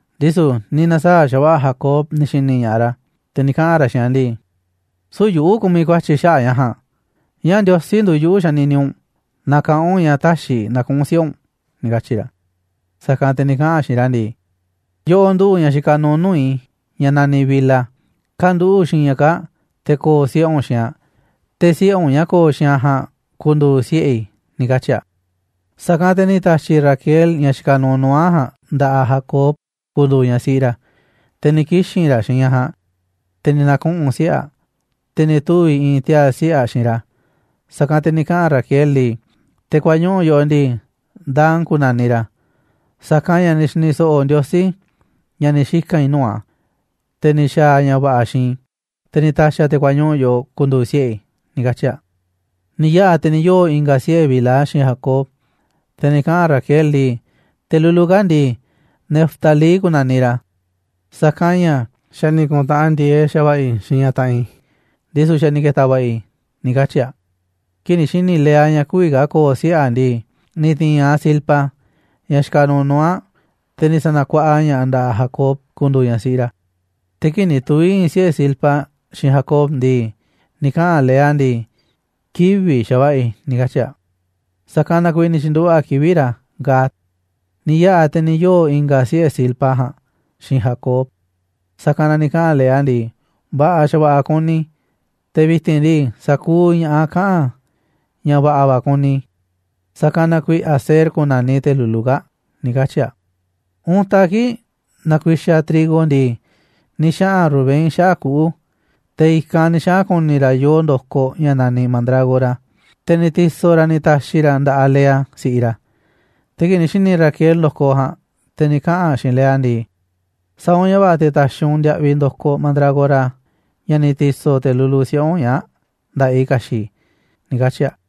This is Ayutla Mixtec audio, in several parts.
Ndisu̱ ni̱ na̱saa̱ꞌ xa̱va̱ꞌa̱ Jacob ni̱ xi̱ni̱ ña̱ꞌaꞌ ra̱, te̱ ni̱ kaꞌa̱n ra̱ xiinꞌ aꞌ ndii: ―Süu̱ꞌ yuꞌu̱ kumiꞌ ku̱a̱tyi̱ xaꞌa̱ꞌ ña̱ ja̱a̱nꞌ, ñáá Ndiosí nduuꞌ yuꞌu̱ xanini u̱nꞌ, na kaꞌán u̱nꞌ ña̱ täxiꞌ i̱ na̱kuꞌu̱n siꞌe̱ u̱nꞌ ―ni̱ katyi̱ ra̱. Sa̱kanꞌ te̱ ni̱ kaꞌa̱n aꞌ xiinꞌ ra̱ ndii: ―Yoꞌoꞌ nduꞌu̱ꞌ ñaꞌ xikaꞌ nuuꞌ nuu̱ꞌ i̱, ñaꞌ naniꞌ Bilha, ka̱nduꞌu̱ꞌ xiinꞌ ñaꞌ kaa̱ꞌ te̱ ko̱o̱ siꞌe̱ u̱nꞌ xiinꞌ aꞌ, te̱ siꞌe̱ u̱nꞌ ñaꞌ ko̱o̱ xiinꞌ aꞌ ja̱a̱nꞌ ku̱ndu̱u̱ siꞌe̱ i̱ ―ni̱ katyi̱ aꞌ. Sa̱kanꞌ te̱ ni̱ ta̱xi̱ Raquel ñaꞌ xikaꞌ nuuꞌ nuu̱ꞌ aꞌ ja̱a̱nꞌ nda̱ꞌaꞌ Jacob ku̱ndu̱u̱ ñaꞌ siꞌi ra̱. Te̱ ni̱ kixi̱n ra̱ xiinꞌ ñaꞌ ja̱a̱nꞌ, te̱ ni̱ na̱kuꞌu̱n siꞌe̱ aꞌ, te̱ ni̱ tuvi̱ i̱i̱n tiaa̱ siꞌe̱ aꞌ xiinꞌ ra̱. Sa̱kanꞌ te̱ ni̱ kaꞌa̱n Raquel ndii: ―Te̱ kuañuꞌu̱ yoꞌoꞌ ndii, Dan ku̱na̱niꞌ ra̱, sa̱kanꞌ ña̱ ni̱ xi̱ni̱ so̱ꞌo̱ Ndiosí ña̱ ni̱ xika̱n i̱ nuu̱ꞌ a̱, te̱ ni̱ xa̱a̱ a̱ ña̱ va̱ꞌa̱ xiinꞌ i̱, te̱ ni̱ ta̱xi̱ a̱ te̱ kuañuꞌu̱ yoꞌoꞌ ku̱ndu̱u̱ siꞌe̱ i̱ ―ni̱ katyi̱ a̱. Ni̱ yaꞌa̱ te̱ ni̱ yoo̱ i̱nga̱ siꞌe̱ Bilha xiinꞌ Jacob, te̱ ni̱ kaꞌa̱n Raquel ndii: ―Te̱ lulu kaa̱ꞌ ndii, Neftalí ku̱na̱niꞌ ra̱, sa̱kanꞌ ña̱ xa̱ ni̱ ku̱ntaꞌanꞌ ndi̱e̱eꞌ xa̱va̱ꞌa̱ i̱ xiinꞌ ñaꞌ taꞌanꞌ i̱, ndisu̱ xa̱ ni̱ ke̱ta̱ va̱ꞌa̱ i̱ ―ni̱ katyi̱ aꞌ. Kii̱ꞌ ni̱ xi̱ni̱ Lea ña̱ kü̱vi̱ ka̱ ko̱o̱ siꞌe̱ aꞌ ndii, ni̱ ti̱i̱n aꞌ Zilpa, ñaꞌ xikaꞌ nuuꞌ nuu̱ꞌ aꞌ, te̱ ni̱ sa̱na̱kuaꞌa ña̱ꞌaꞌ aꞌ nda̱ꞌaꞌ Jacob ku̱ndu̱u̱ ñaꞌ siꞌi ra̱. Te̱ kii̱ꞌ ni̱ tuvi̱ i̱i̱n siꞌe̱ Zilpa xiinꞌ Jacob ndii, ni̱ kaꞌa̱n Lea ndii: ―Kivi̱ꞌ xa̱va̱ꞌa̱ i̱ ―ni̱ katyi̱ aꞌ. Sa̱kanꞌ na kuiiꞌ ni̱ tyi̱nduꞌu̱ꞌ aꞌ kivi̱ꞌ ra̱ Gad. Ni̱ yaꞌa̱ te̱ ni̱ yoo̱ i̱nga̱ siꞌe̱ Zilpa ja̱a̱nꞌ xiinꞌ Jacob. Sa̱kanꞌ na ni̱ kaꞌa̱n Lea ndii: ―Va̱ꞌa̱ xa̱va̱ꞌa̱ kuni i̱, te̱ vi̱ti̱n ndii, sa̱kuuꞌ ña̱ꞌaꞌ kaꞌa̱n ña̱ va̱ꞌa̱ va̱ kuni i̱, sa̱kanꞌ na kuiiꞌ Aser ku̱na̱niꞌ te̱ lulu kaa̱ꞌ ―ni̱ katyi̱ aꞌ. Untaꞌ kii̱ꞌ nakuixaꞌ trigo ndii, ni̱ xaꞌa̱n Rubén xaꞌa̱ꞌ kuꞌu̱, te̱ i̱kanꞌ ni̱ xaꞌa̱n ku̱ni̱ ra̱ yoo ndo̱koꞌ ña̱ naniꞌ mandrágora, te̱ ni̱ ti̱so̱ ra̱ a̱ ni̱ ta̱xi̱ ra̱ nda̱ꞌaꞌ Lea, si̱ꞌiꞌ ra̱. Te̱ kii̱ꞌ ni̱ xi̱ni̱ Raquel ndo̱koꞌ ja̱a̱nꞌ, te̱ ni̱ kaꞌa̱n aꞌ xiinꞌ Lea ndii: ―Sa̱a̱ u̱nꞌ ña̱ va̱ꞌa̱ te̱ ta̱xi̱ u̱nꞌ ndiaꞌviꞌ ndo̱koꞌ mandrágora, ña̱ ni̱ ti̱so̱ te̱ lulu siꞌe̱ u̱nꞌ ñaa̱ꞌ, nda̱ꞌaꞌ i̱ ka̱xi̱ꞌ i̱ ―ni̱ katyi̱ aꞌ.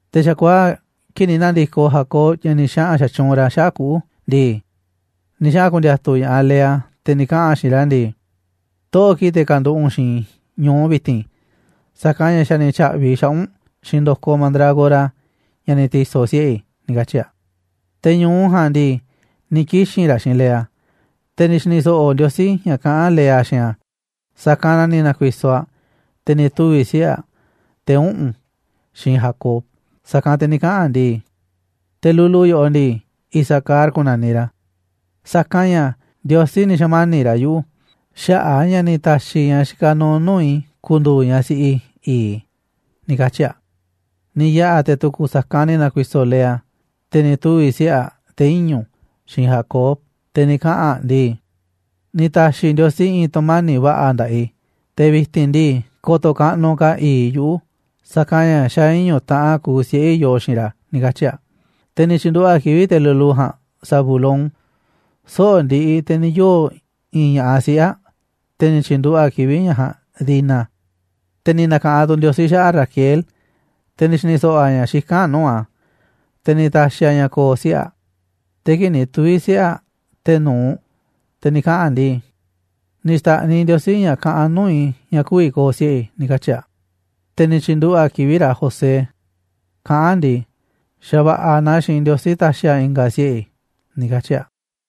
Te̱ xa̱kuaa̱ꞌ kii̱ꞌ ni̱ na̱ndi̱koꞌ Jacob ña̱ ni̱ xaꞌa̱n xatyuunꞌ ra̱ xaꞌa̱ꞌ kuꞌu̱ ndii, ni̱ xaꞌa̱n ku̱ndi̱a̱tu̱ ña̱ꞌaꞌ Lea, te̱ ni̱ kaꞌa̱n aꞌ xiinꞌ ra̱ ndii: ―Toꞌo̱ꞌ kii̱ꞌ te̱ ka̱nduꞌu̱ꞌ u̱nꞌ xiinꞌ i̱ ñu̱u vi̱ti̱n, sa̱kanꞌ ña̱ xa̱ ni̱ tya̱ꞌvi̱ i̱ xaꞌa̱ꞌ u̱nꞌ xiinꞌ ndo̱koꞌ mandrágora ña̱ ni̱ ti̱so̱ siꞌe̱ i̱ ―ni̱ katyi̱ aꞌ. Te̱ ñu̱u ja̱a̱nꞌ ndii, ni̱ kixi̱n ra̱ xiinꞌ Lea. Te̱ ni̱ xi̱ni̱ so̱ꞌo̱ Ndiosí ña̱ kaꞌán Lea xiinꞌ a̱, sa̱kanꞌ na ni̱ na̱ku̱i̱so̱ aꞌ, te̱ ni̱ tuvi̱ siꞌe̱ aꞌ, te̱ uꞌu̱n, xiinꞌ Jacob. Sa̱kanꞌ te̱ ni̱ kaꞌa̱n aꞌ ndii: ―Te̱ lulu yoꞌoꞌ ndii, Isacar ku̱na̱niꞌ ra̱, sa̱kanꞌ ña̱ Ndiosí ni̱ xa̱mani̱ꞌ ra̱ yuꞌu̱ xaꞌa̱ꞌ a̱ ña̱ ni̱ ta̱xi̱ ñaꞌ xikaꞌ nuuꞌ nuu̱ꞌ i̱ ku̱ndu̱u̱ ñaꞌ siꞌi i̱i̱ꞌ i̱ ―ni̱ katyi̱ aꞌ. Ni̱ yaꞌa̱ te̱ tu̱ku̱ sa̱kanꞌ ni̱ na̱ku̱i̱so̱ Lea, te̱ ni̱ tuvi̱ siꞌe̱ aꞌ, te̱ iñu̱, xiinꞌ Jacob. Te̱ ni̱ kaꞌa̱n aꞌ ndii: ―Ni̱ ta̱xi̱ Ndiosí i̱i̱n tu̱mani̱ꞌ va̱ꞌa̱ nda̱ꞌaꞌ i̱, te̱ vi̱ti̱n ndii, ko̱to̱ kaꞌnuꞌ ka̱ i̱i̱ꞌ i̱ yuꞌu̱, sa̱kanꞌ ña̱ xa̱ iñu̱ taꞌan kuuꞌ siꞌe̱ i̱ yoo xiinꞌ ra̱ ―ni̱ katyi̱ aꞌ. Te̱ ni̱ tyi̱nduꞌu̱ꞌ aꞌ kivi̱ꞌ te̱ lulu ja̱a̱nꞌ Zabulón. Soꞌo̱ꞌ ndiꞌiꞌ te̱ ni̱ yoo̱ i̱i̱n ña̱ꞌaꞌ siꞌe̱ aꞌ, te̱ ni̱ tyi̱nduꞌu̱ꞌ aꞌ kivi̱ꞌ ñaꞌ ja̱a̱nꞌ Dina. Te̱ ni̱ na̱ka̱ꞌanꞌ tu̱ Ndiosí xaꞌa̱ꞌ Raquel, te̱ ni̱ xi̱ni̱ so̱ꞌo̱ a̱ ña̱ xikán aꞌ nuu̱ꞌ a̱, te̱ ni̱ ta̱xi̱ a̱ ña̱ ko̱o̱ siꞌe̱ aꞌ. Te̱ kii̱ꞌ ni̱ tuvi̱ siꞌe̱ aꞌ te̱ nu̱uꞌ, te̱ ni̱ kaꞌa̱n aꞌ ndii: ―Ni̱ xta̱ꞌniꞌ Ndiosí ña̱ kaꞌanꞌ nuu̱ꞌ i̱ ña̱ kü̱vi̱ ko̱o̱ siꞌe̱ i̱ ―ni̱ katyi̱ aꞌ. Te̱ ni̱ tyi̱nduꞌu̱ꞌ aꞌ kivi̱ꞌ ra̱ José kaꞌán aꞌ ndii: ―Xa̱va̱ꞌa̱ naaꞌ xiinꞌ Ndiosí ta̱xi̱ a̱ i̱nga̱ siꞌe̱ i̱ ―ni̱ katyi̱ aꞌ.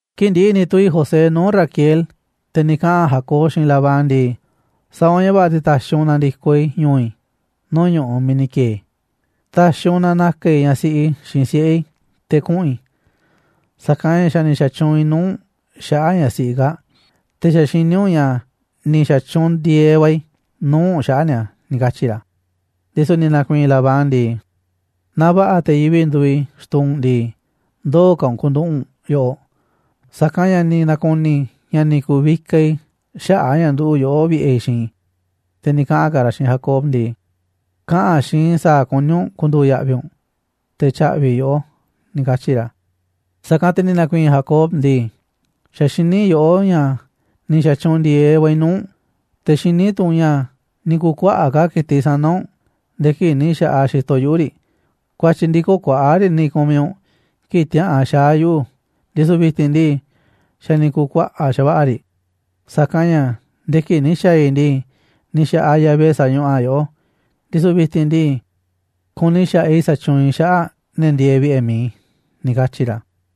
Kii̱ꞌ ndi̱ꞌi̱ ni̱ tuvi̱ José nuu̱ꞌ Raquel, te̱ ni̱ kaꞌa̱n Jacob xiinꞌ Labán ndii: ―Sa̱a̱ u̱nꞌ ña̱ va̱ꞌa̱, te̱ ta̱xi̱ u̱nꞌ na̱ndi̱koꞌ i̱ ñu̱u̱ i̱ nuu̱ꞌ ñu̱ꞌuꞌ miiꞌ ni̱ ki̱e̱e̱ i̱. Ta̱xi̱ u̱nꞌ na na̱ka̱ i̱ ñaꞌ siꞌi i̱ xiinꞌ siꞌe̱ i̱ te̱ kuꞌu̱n i̱, sa̱kanꞌ ña̱ xa̱ ni̱ xatyuunꞌ i̱ nuu̱ꞌ u̱nꞌ xaꞌa̱ꞌ ñaꞌ siꞌi i̱ kaa̱ꞌ, te̱ xa̱ xiní u̱nꞌ ña̱ ni̱ xa̱tyuunꞌ ndi̱e̱eꞌ va̱ i̱ nuu̱ꞌ u̱nꞌ xaꞌa̱ꞌ ni̱a̱ ―ni̱ katyi̱ ra̱. Ndisu̱ ni̱ na̱ku̱i̱i̱n Labán ndii: ―Naaꞌ va̱ꞌa̱ te̱ yivi̱ꞌ nduuꞌ i̱ xtuu u̱nꞌ ndii, ndoo̱ ka̱ u̱nꞌ ku̱nduꞌu̱ꞌ u̱nꞌ yoꞌoꞌ, sa̱kanꞌ ña̱ ni̱ na̱ku̱ni̱ i̱ ña̱ ni̱ ku̱vikaꞌ i̱ xaꞌa̱ꞌ a̱ ña̱ nduꞌu̱ꞌ yoꞌó vi̱ꞌe̱ i̱ xiinꞌ i̱. Te̱ ni̱ kaꞌa̱n ka̱ ra̱ xiinꞌ Jacob ndii: ―Kaꞌa̱n xiinꞌ i̱ sa̱a̱ kuní u̱nꞌ ku̱ndu̱u̱ ya̱ꞌvi̱ u̱nꞌ, te̱ tya̱ꞌvi̱ i̱ yoꞌó ―ni̱ katyi̱ ra̱. Sa̱kanꞌ te̱ ni̱ na̱ku̱i̱i̱n Jacob ndii. ―Xa̱ xiní yoꞌó ña̱ ni̱ xa̱tyuunꞌ ndi̱e̱eꞌ va̱ i̱ nuu̱ꞌ u̱nꞌ, te̱ xiní tu̱ u̱nꞌ ña̱ ni̱ ku̱kuaꞌa̱ꞌ ka̱ ki̱tiꞌ sana̱ u̱nꞌ nde̱e̱ kii̱ꞌ ni̱ xa̱ꞌaꞌ xi̱to̱ yuꞌu̱ riꞌ. Ku̱a̱tyi̱ ndii, köo̱ꞌ kuaꞌa̱ꞌ riꞌ ni̱ ku̱miꞌ u̱nꞌ kii̱ꞌ tiäꞌa̱an xaa̱ yuꞌu̱, ndisu̱ vi̱ti̱n ndii, xa̱ ni̱ ku̱u̱ kuaꞌa̱ꞌ xa̱va̱ꞌa̱ riꞌ, sa̱kanꞌ ña̱ nde̱e̱ kii̱ꞌ ni̱ xa̱a̱ i̱ ndii, ni̱ xa̱ꞌaꞌ Yahvé sañuꞌuꞌ a̱ yoꞌó, ndisu̱ vi̱ti̱n ndii, kuni xa̱ꞌaꞌ i̱ sa̱tyuunꞌ i̱ xaꞌa̱ꞌ ne̱ ndieeꞌ vi̱ꞌe̱ mi̱iꞌ i̱ ―ni̱ katyi̱ ra̱.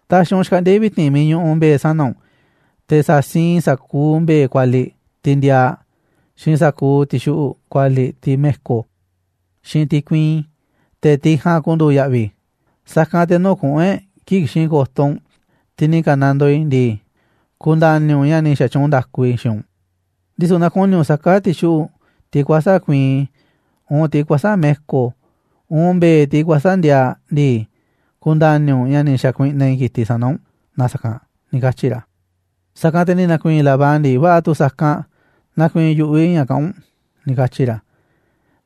Ta̱xi̱ u̱nꞌ xkaꞌndi̱a̱ i̱ vi̱ti̱n miiꞌ ñuꞌuꞌ mbe̱e̱ sana̱ u̱nꞌ, te̱ sa̱siinꞌ i̱ sa̱kuuꞌ mbe̱e̱ kualiꞌ tiꞌ ndiaaꞌ, xiinꞌ sa̱kuuꞌ ti̱xuꞌu̱ꞌ kualiꞌ tiꞌ me̱ko̱, xiinꞌ tiꞌ kuiin, te̱ tiꞌ ja̱a̱nꞌ ku̱ndu̱u̱ ya̱ꞌvi̱ i̱. Sa̱kanꞌ te̱ nuu̱ꞌ kuꞌu̱n e̱ꞌ kii̱ꞌ ki̱xi̱n ko̱to̱ u̱nꞌ tiꞌ ni̱ ka̱nandoo i̱ ndii, ku̱nda̱ni̱ u̱nꞌ ña̱ ni̱ xa̱tyuunꞌ nda̱ku i̱ xiinꞌ u̱nꞌ. Ndisu̱ naaꞌ ku̱ni̱ u̱nꞌ saká ti̱xuꞌu̱ꞌ tiꞌ kuäsa̱ꞌ kuiin, uun tiꞌ kuäsa̱ꞌ me̱ko̱, uun mbe̱e̱ tiꞌ kuäsa̱ꞌ ndiaaꞌ ndii, ku̱nda̱ni̱ u̱nꞌ ña̱ ni̱ xa̱kuiꞌnaꞌ i̱ ki̱tiꞌ sana̱ u̱nꞌ na sa̱kanꞌ ―ni̱ katyi̱ ra̱. Sa̱kanꞌ te̱ ni̱ na̱ku̱i̱i̱n Labán ndii: ―Va̱ꞌa̱ tu̱ sa̱kanꞌ, nakuiinꞌ yu̱ꞌuꞌ i̱ ña̱ kaꞌán u̱nꞌ ―ni̱ katyi̱ ra̱.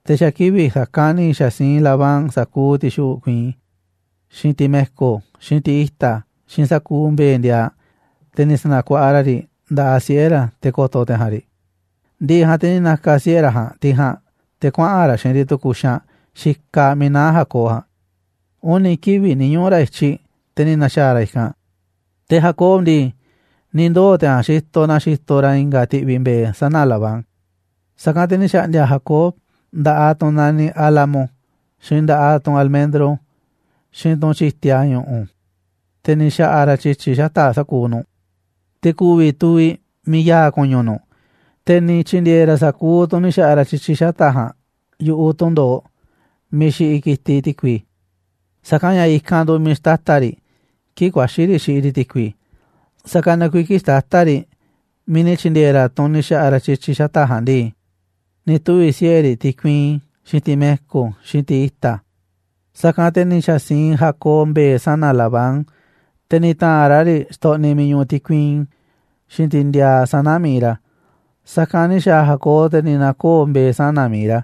Te̱ xa̱ kivi̱ꞌ sa̱kanꞌ ni̱ xa̱ siinꞌ Labán sa̱kuuꞌ ti̱xuꞌu̱ꞌ kuiin, xiinꞌ tiꞌ me̱ko̱, xiinꞌ tiꞌ i̱ta̱, xiinꞌ sa̱kuuꞌ mbe̱e̱ ndiaaꞌ, te̱ ni̱ sa̱na̱kuaꞌa ra̱ riꞌ nda̱ꞌaꞌ siꞌe̱ ra̱, te̱ ko̱to̱ te̱ ja̱a̱nꞌ riꞌ. Ndi̱ꞌi̱ ja̱a̱nꞌ te̱ ni̱ na̱ka̱ siꞌe̱ ra̱ ja̱a̱nꞌ tiꞌ ja̱a̱nꞌ te̱ kuaꞌa̱n ra̱ xiinꞌ riꞌ tu̱ku̱ xaanꞌ xikaꞌ miiꞌ naá Jacob ja̱a̱nꞌ, uni̱ kivi̱ꞌ ni̱ ñuꞌu̱ ra̱ i̱tyiꞌ, te̱ ni̱ na̱xaa̱ ra̱ i̱kanꞌ. Te̱ Jacob ndii, ni̱ ndoo̱ te̱ ja̱a̱nꞌ xitoꞌ na xitoꞌ ra̱ i̱nga̱ ti̱ꞌvi̱ mbe̱e̱ sana̱ Labán ja̱a̱nꞌ. Sa̱kanꞌ te̱ ni̱ xa̱ꞌndi̱a̱ Jacob nda̱ꞌaꞌ tunꞌ naniꞌ álamo, xiinꞌ nda̱ꞌaꞌ tunꞌ almendro, xiinꞌ tunꞌ tyi̱tia ñu̱ꞌu̱, te̱ ni̱ xa̱ꞌa̱ ra̱ tyi̱tyi̱ xata̱ꞌ sa̱kuuꞌ nu̱ꞌ, te̱ ku̱vi̱ tuviꞌ miiꞌ ya̱a̱ ku̱ñu̱ nu̱ꞌ. Te̱ ni̱ tyi̱ndi̱e̱e̱ ra̱ sa̱kuuꞌ tunꞌ ni̱ xa̱ꞌa̱ ra̱ tyi̱tyi̱ xata̱ꞌ ja̱a̱nꞌ yu̱ꞌuꞌ tundo̱oꞌ miiꞌ xiꞌiꞌ ki̱tiꞌ ti̱kui. Sa̱kanꞌ ña̱ i̱kanꞌ nduuꞌ miiꞌ xtata̱ riꞌ, kii̱ꞌ ku̱a̱xi̱ riꞌ xiꞌiꞌ riꞌ ti̱kui. Sa̱kanꞌ na kuiiꞌ kii̱ꞌ xtata̱ riꞌ miiꞌ ni̱ tyi̱ndi̱e̱e̱ ra̱ tunꞌ ni̱ xa̱ꞌa̱ ra̱ tyi̱tyi̱ xata̱ꞌ ja̱a̱nꞌ ndii, ni̱ tuvi̱ siꞌe̱ riꞌ tiꞌ kuiin, xiinꞌ tiꞌ me̱ko̱, xiinꞌ tiꞌ i̱ta̱. Sa̱kanꞌ te̱ ni̱ xa̱siinꞌ Jacob mbe̱e̱ sana̱ Labán, te̱ ni̱ ta̱a̱nꞌ ra̱ riꞌ xtoꞌniꞌ miiꞌ ñuꞌuꞌ tiꞌ kuiin, xiinꞌ tiꞌ ndiaaꞌ sana̱ mi̱iꞌ ra̱. Sa̱kanꞌ ni̱ xa̱a̱ Jacob, te̱ ni̱ na̱koo̱ mbe̱e̱ sana̱ mi̱iꞌ ra̱,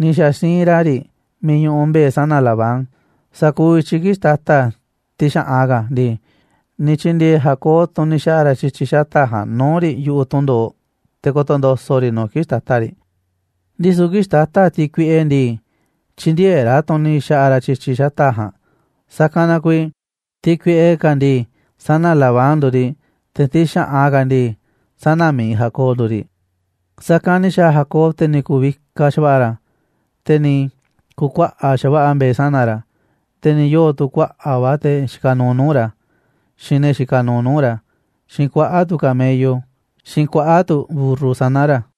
ni̱ xa̱ siinꞌ ra̱ riꞌ miiꞌ ñuꞌuꞌ mbe̱e̱ sana̱ Labán. Sa̱kuuꞌ i̱tyiꞌ kii̱ꞌ xtata̱ tiꞌ xa̱ꞌan ka̱ ndii, ni̱ tyi̱ndi̱e̱e̱ Jacob tunꞌ ni̱ xa̱ꞌa̱ ra̱ tyi̱tyi̱ xata̱ꞌ ja̱a̱nꞌ nuu̱ꞌ riꞌ yu̱ꞌuꞌ tundo̱oꞌ te̱ ko̱to̱ ndo̱so̱ꞌ riꞌ nu̱ꞌ kii̱ꞌ xtata̱ riꞌ. Ndisu̱ kii̱ꞌ xtata̱ tiꞌ kuiꞌe ndii, tyïndieeꞌ ra̱ tunꞌ ni̱ xa̱ꞌa̱ ra̱ tyi̱tyi̱ xata̱ꞌ ja̱a̱nꞌ, sa̱kanꞌ na kuiiꞌ tiꞌ kuiꞌe ka̱ ndii, sana̱ Labán nduuꞌ riꞌ, te̱ tiꞌ xa̱ꞌan ka̱ ndii, sana̱ mi̱iꞌ Jacob nduuꞌ riꞌ. Sa̱kanꞌ ni̱ xa̱a̱ Jacob, te̱ ni̱ ku̱vikaꞌ xa̱va̱ꞌa̱ ra̱, te̱ ni̱ ku̱kuaꞌa̱ꞌ xa̱va̱ꞌa̱ mbe̱e̱ sana̱ ra̱, te̱ ni̱ yoo̱ tu̱ kuaꞌa̱ꞌ va̱ te̱ xikaꞌ nuuꞌ nuu̱ꞌ ra̱, xiinꞌ ne̱ xikaꞌ nuuꞌ nuu̱ꞌ ra̱, xiinꞌ kuaꞌa̱ꞌ tu̱ camello, xiinꞌ kuaꞌa̱ꞌ tu̱ mburru sana̱ ra̱.